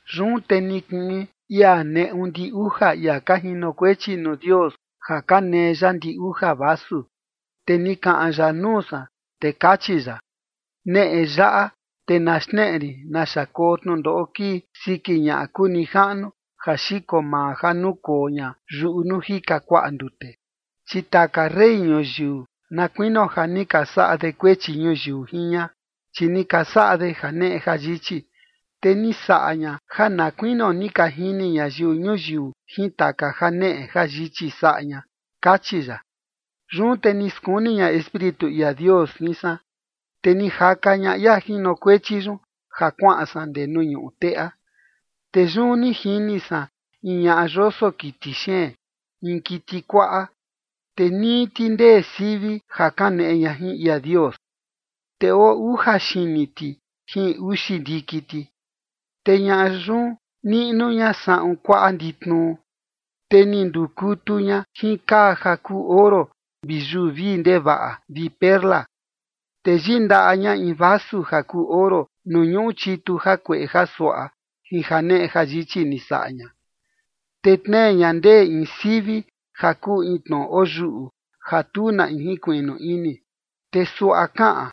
Yun te ni kii in ia neꞌu ndi uja ia ka jinokuechi nuu Dios ja ka nee ya ndi uja vasu. Te ni kaꞌan ya nuu san, te kachi ya: ―Neꞌe yaꞌa, te na xneꞌe rin naxa koo tnundoꞌo kii siki ñaꞌa kuu nijaꞌnu ja xiko maa ja nukoo ña yuꞌu nuu jika kuaꞌa ndute. Chi taka rey ñuyiu, na kuinio ja ni ka saꞌa de kuechi ñuyiu jin ña, chi ni ka saꞌa de janeꞌe jayichi. Te ni saꞌa ña ja na kuinio ni ka jini ñayiu ñuyiu jin taka janeꞌe jayichi saꞌa ña ―kachi ya. Yun te ni skuni ña Espíritu ia Dios jin san, te ni jaka ña ia jinokuechi yun ja kuaꞌan san ndee nuu ñuꞌu teꞌa. Te yun ni jini san in ñaꞌa yoso kiti xeen, in kiti kuaꞌa, te nii ti ndee sivi ja kaneꞌe ña jin ia Dios. Te oo uja xini ti jin uxi ndiki ti. Te ñaꞌa yun niꞌnu ña saꞌun kuaꞌa nditnuu, te ni ndukutu ña jin kaa ja kuu oro vi yuu vii ndevaꞌa vi perla. Te yindaꞌa ña in vasu ja kuu oro nuu ñuꞌu chitu jakueꞌe jasuaꞌa jin janeꞌe jayichi ni saꞌa ña. Te tnee ña ndee in sivi ja kuu in tnoꞌo oyuꞌu ja tu na in jinkuiꞌnu ini, te suaꞌa kaꞌan: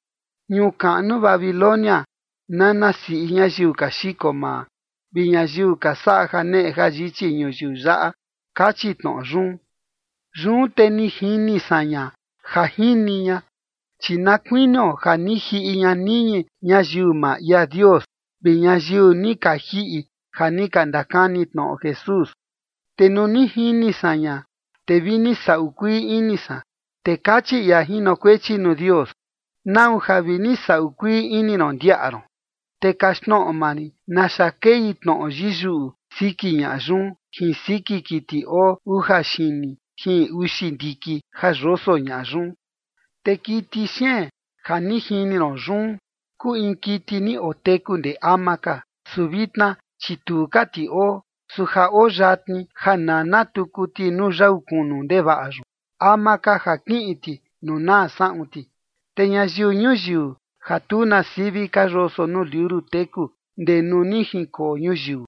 “Ñuu kaꞌnu Babilonia, nana siꞌi ñayiu ka xiko maa vi ñayiu ka saꞌa janeꞌe jayichi ñuyiu yaꞌa” kachi tnoꞌo yun. Yun te ni jini san ña ja jini ña, chi na kuinio ja ni jiꞌi ña niñi ñayiu maa ia Dios vi ñayiu ni ka jiꞌi ja ni ka ndakani tnoꞌo Jesús. Te nuu ni jini san ña, te vi ni saꞌu kuii ini san. Te kachi ia jinokuechi nuu Dios: ―¿Nau ja vi ni saꞌu kuii ini ron, ndiaꞌa ron? Te kaxtnoꞌo maa rin naxa kei kaꞌan tnoꞌo yiyuꞌu siki ñaꞌa yun jin siki kiti oo uja xini jin uxi ndiki ja yoso ña yun. Te kiti xeen ja ni jini ron yun kuu in kiti ni oteku ndee ama ka, su vitna, chi tu ka ti oo. Su ja oo yatni ja nana tuku ti nuu yau kunu ndevaꞌa yun, ama ka ja kiꞌin ti nuu naa saꞌun ti. Te ñayiu ñuyiu ja tu na sivi ka yoso nuu liuru teku ndee nuu ni jinkoo ñuyiu,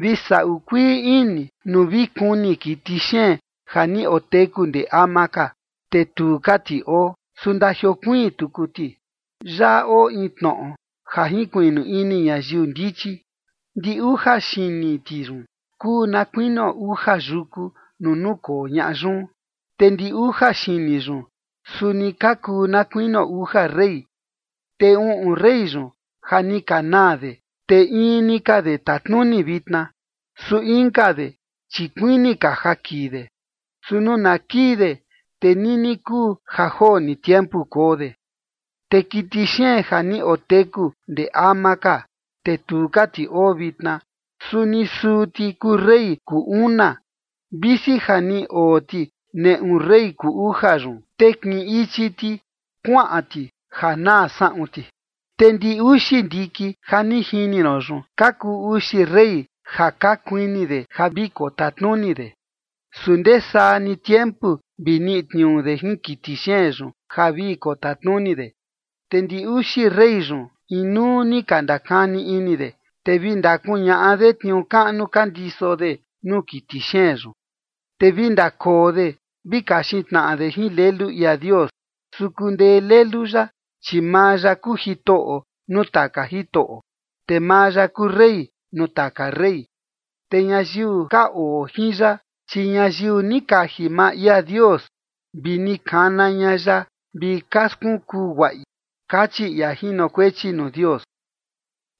vi saꞌu kuii ini nuu vi kuni kiti xeen ja ni oteku ndee ama ka, te tu ka ti oo, su ndajiokuiin tuku ti. Yaꞌa oo in tnoꞌo ja jinkuiꞌnu ini ñayiu ndichi. Ndi uja xini ti yun kuu na kuinio uja yuku nuu nukoo ñaꞌa yun. Te ndi uja xini yun, suni ka kuu na kuinio uja rey. Te uꞌun rey yun ja ni ka naa de, te in ni ka de tatnuni vitna, su inka de chi kuini ka ja kii de. Su nuu na kii de, te nini kuu ja joo ni tiempu koo de. Te kiti xeen ja ni oteku ndee ama ka, te tu ka ti oo vitna, suni suu ti kuu rey kuu una, visi ja ni oo ti neꞌu rey kuu uja yun, te kiꞌin ichi ti kuaꞌan ti ja naa saꞌun ti. ’Te ndi uxi ndiki ja ni jini ron yun, ka kuu uxi rey ja ka kuini de ja vi kotatnuni de. Su ndesaa ni tiempu vi niꞌi tniuu de jin kiti xeen yun ja vi kotatnuni de. Te ndi uxi rey yun inuu ni ka ndakani ini de, te vi ndakuñaꞌa de tniuu kaꞌnu ka ndiso de nuu kiti xeen yun. Te vi ndakoo de vi kaxin tnaꞌa de jin Lelu ia Dios, su kundee Lelu ya. Chi maa ya kuu Jitoꞌo nuu taka jitoꞌo, te maa ya kuu Rey nuu taka rey. Te ñayiu ka oo jin ya, chi ñayiu ni kaji maa ia Dios vi ni kana ña ya vi ka skunkuu guaꞌi ―kachi ia jinokuechi nuu Dios.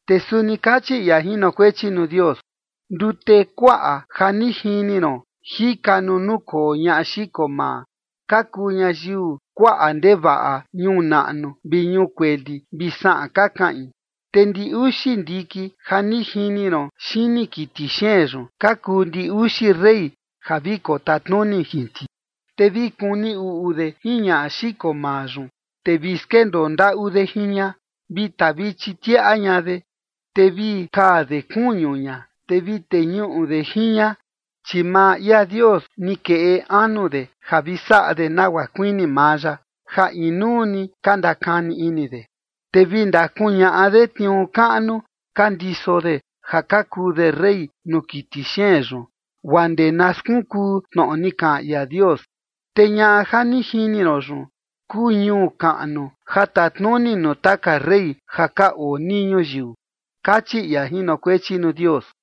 Te suni kachi ia jinokuechi nuu Dios: ―Ndute kuaꞌa ja ni jini ron jika nuu nukoo ñaꞌa xiko maa, ka kuu ñayiu kuaꞌa ndevaꞌa ñuu naꞌnu vi ñuu kueli vi saꞌan ka kaꞌin. Te ndi uxi ndiki ja ni jini ron xini kiti xeen yun, ka kuu ndi uxi rey ja vi kotatnuni jin ti. Te vi kuni uꞌu de jin ñaꞌa xiko maa yun, te vi skendoo ndaꞌu de jin ña, vi tavichi tiaꞌa ña de, te vi kaa de kuñu ña, te vi teñuꞌu de jin ña. Chi maa ia Dios ni keꞌe anu de ja vi saꞌa de nagua kuini maa ya, ja inuu ni ka ndakani ini de, te vi ndakuñaꞌa de tniuu kaꞌnu ka ndiso de ja ka kuu de rey nuu kiti xeen yun, guaa ndee na skunkuu tnoꞌo ni kaꞌan ia Dios. Te ñaꞌa ja ni jini ron yun, kuu ñuu kaꞌnu ja tatnuni nuu taka rey ja ka oo nii ñuyiu ―kachi ia jinokuechi nuu Dios.